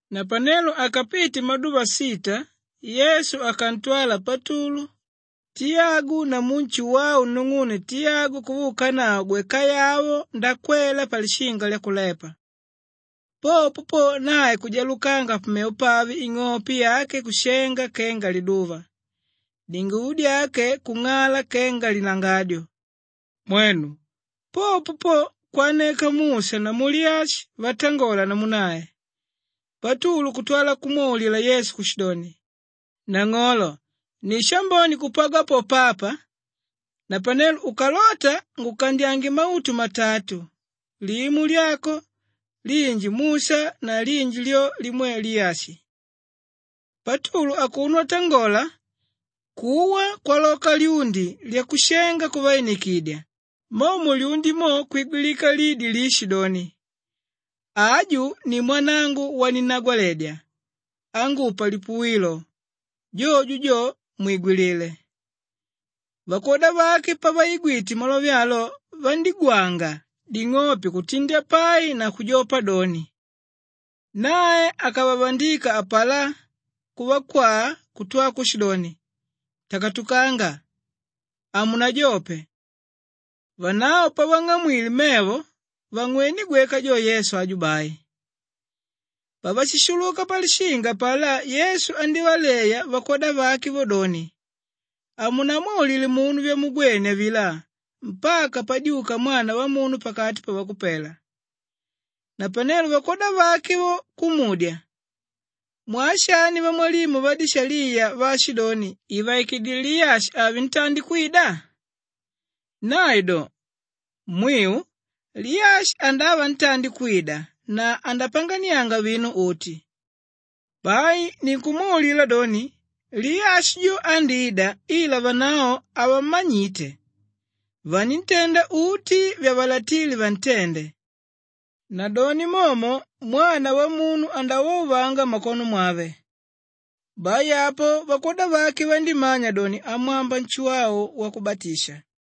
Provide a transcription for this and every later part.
Napanelo akapite maduva sita, Yesu akantwala Patulu, Tiyagu namu Nshuwau nung'une Tiyagu kuvaukanavo gwekayavo ndakwela palishinga lyakulepa. Popo po, nae kujalukanga pamevo pave, ing'ope yake kushenga kenga liduva, dinguvo dyake kung'ala kenga lilangadyo. Mwenu! Popo po kwaneka Musha namu Liyashi vatangola namu nae. Patulu kutwa kumwaulila Yesu kushidoni, “Nang'olo ni shambone kupagwa po papa. Napanelo ukalota, ngukandyange mautu matatu, limo lyako, linji Musha na linji lyo limwe Liyashi.” Patulu akuno atangola, kuwa kwaloka lyundi lyakushenga kuvainikidya, mo mulyundi mo kwigwinika lidi liishidoni, “Aju ni mwanangu waninnagwaledya, ángupa lipuwilo, jojo jo, mwigwilile.” Vakwoda vake pavaigwite malove alo vandígwanga ding'ope kutindya pai na kujopa doni. Nae akavavandika apalá, kuvakwaa kutwa kushidoni, “Takatukanga, hamunajope.” Vanavo pavang'amwile mevo vangwené gweka jo Yesu aju bai. Pavashishuluka palishinga apalá Yesu andívaleya vakwoda vake vo doni, “Hamunamwaulile munu vyamugwene avilá mpaka padyuka Mwana Wamunu pakati pavakupela.” Napanelo vakwoda vake vo kumudya, “Mwaa shani vamwalimu vadishaliya vaashidoni ivaikidile Liyashi ave ntandi kwida?” Nae do, “Mwiu Liyashi andava ntandi kwida na andapanganianga vinu uti. Bai ninkumwaulila doni, Liyashi jo andída ila vanavo havammanyite, vaníntenda uti vyavalatíle vantende. Nadoni momo Mwana Wamunu andauvauvanga mmakono mwave.” Bai apo vakwoda vake vandímanya doni amwamba Nshuwau Wakubatisha.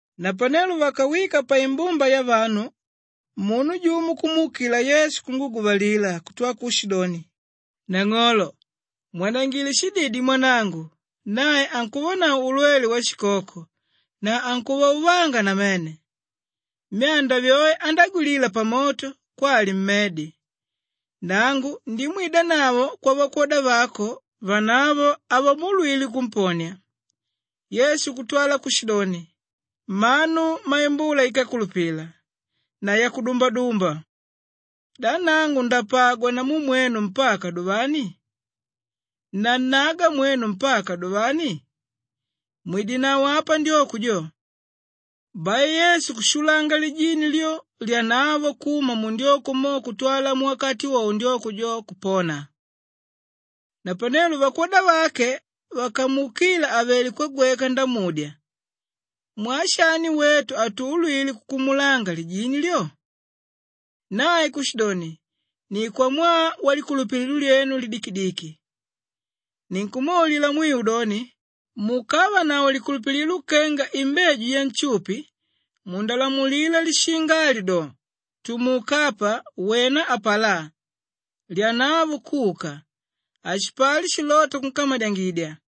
Napanelo vakawika paimbumba yavanu munu jumo kumuukila Yesu kunguguvalila kutwala kushidoni, “Nang'olo mwanangile shididi mwanangu, nae ankuvanavo ulwele washikoko na ankuvauvanga namene. Myanda vyoe andágwilila pamoto kwali mmedi. Nangu ndimwidanavo kwavakwoda vako, vanavo havamuulwile kumponia.” Yesu kutwala kushidoni, “Mmanu mmaimbula íkakulupila na yakudumbadumba! Da nangu ndapagwa namu mwenu mpaka duvani? Nannaga mwenu mpaka duvani? Mwidenavo apa ndyoko jo!” Bai Yesu kushulanga lijini lyo, lyanavo kuma mundyoko mo kutwala muwakati wowo ndyoko jo kupona. Napanelo vakwoda vake vakamuukila àvele kwagweka ndamudya, “Mwaa shani wetu hatuulwile kukumulanga lijini lyo?” Nae kushidoni, “Ni kwamwaa walikulupililo lyenu lidikidiki. Ninkumwaulila mwiu doni, mukavanavo likulupililo kenga imbeju yanshupi mundalamulila lishinga ali do, ‘Tumuka apa wena apalá,’ lyanavo kuka. Hashipali shilóta kunkamadyangidya.”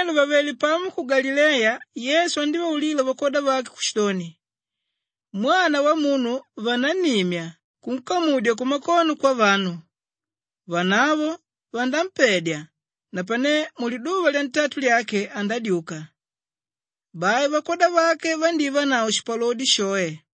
Napanelo vàvele pamo ku Galileya, Yesu andívaulila vakwoda vake kushidoni, “Mwana Wamunu vanannimya kunkamudya kumakono kwavanu, vanavo vanampedya napane muliduva lyantatu lyake andadyuka.” Bai vakwoda vake vandívanavo shipalodi shoe.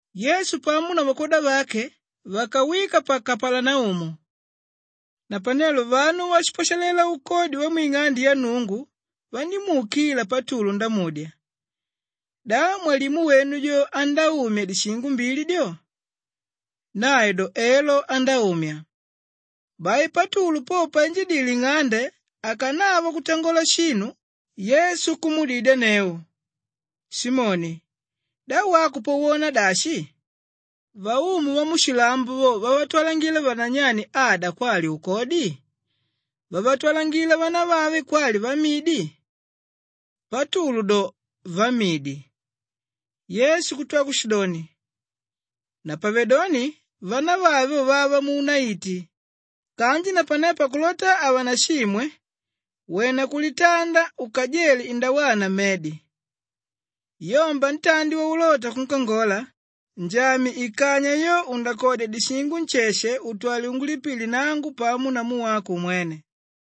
Yesu pamo na vakwoda vake vakawika pa Kapalanaumu. Napanelo vanu váshipwashalela ukodi wamwing'ande ya Nnungu vandímuukila Patulu ndamudya, “Da mwalimu wenu jo andáumya dishingo mbili dyo?” Nae do, “Elo andáumya.” Bai Patulu po painjidile nng'ande akanava kutangola shinu, Yesu kumuudidyanneu, “Simoni, da wako po wona dashi? Vaumu vamushilambo vo vavatwalangila vananyanyi ada kwali ukodi? Vavatwalangila vanavave kwali vamidi?” Patulu do, “Vamidi.” Yesu kutwa kushidoni, “Napavedoni vanavave vo vava muunaiti. Kanji napanelo pakulota havanashimwe, wena kulitanda ukajele indawana mmedi. Yomba ntandi waulota kunkangola njamye ikanywa yo undakodya dishingo nsheshe utwale ungulipile nangu pamo namu wako umwene.”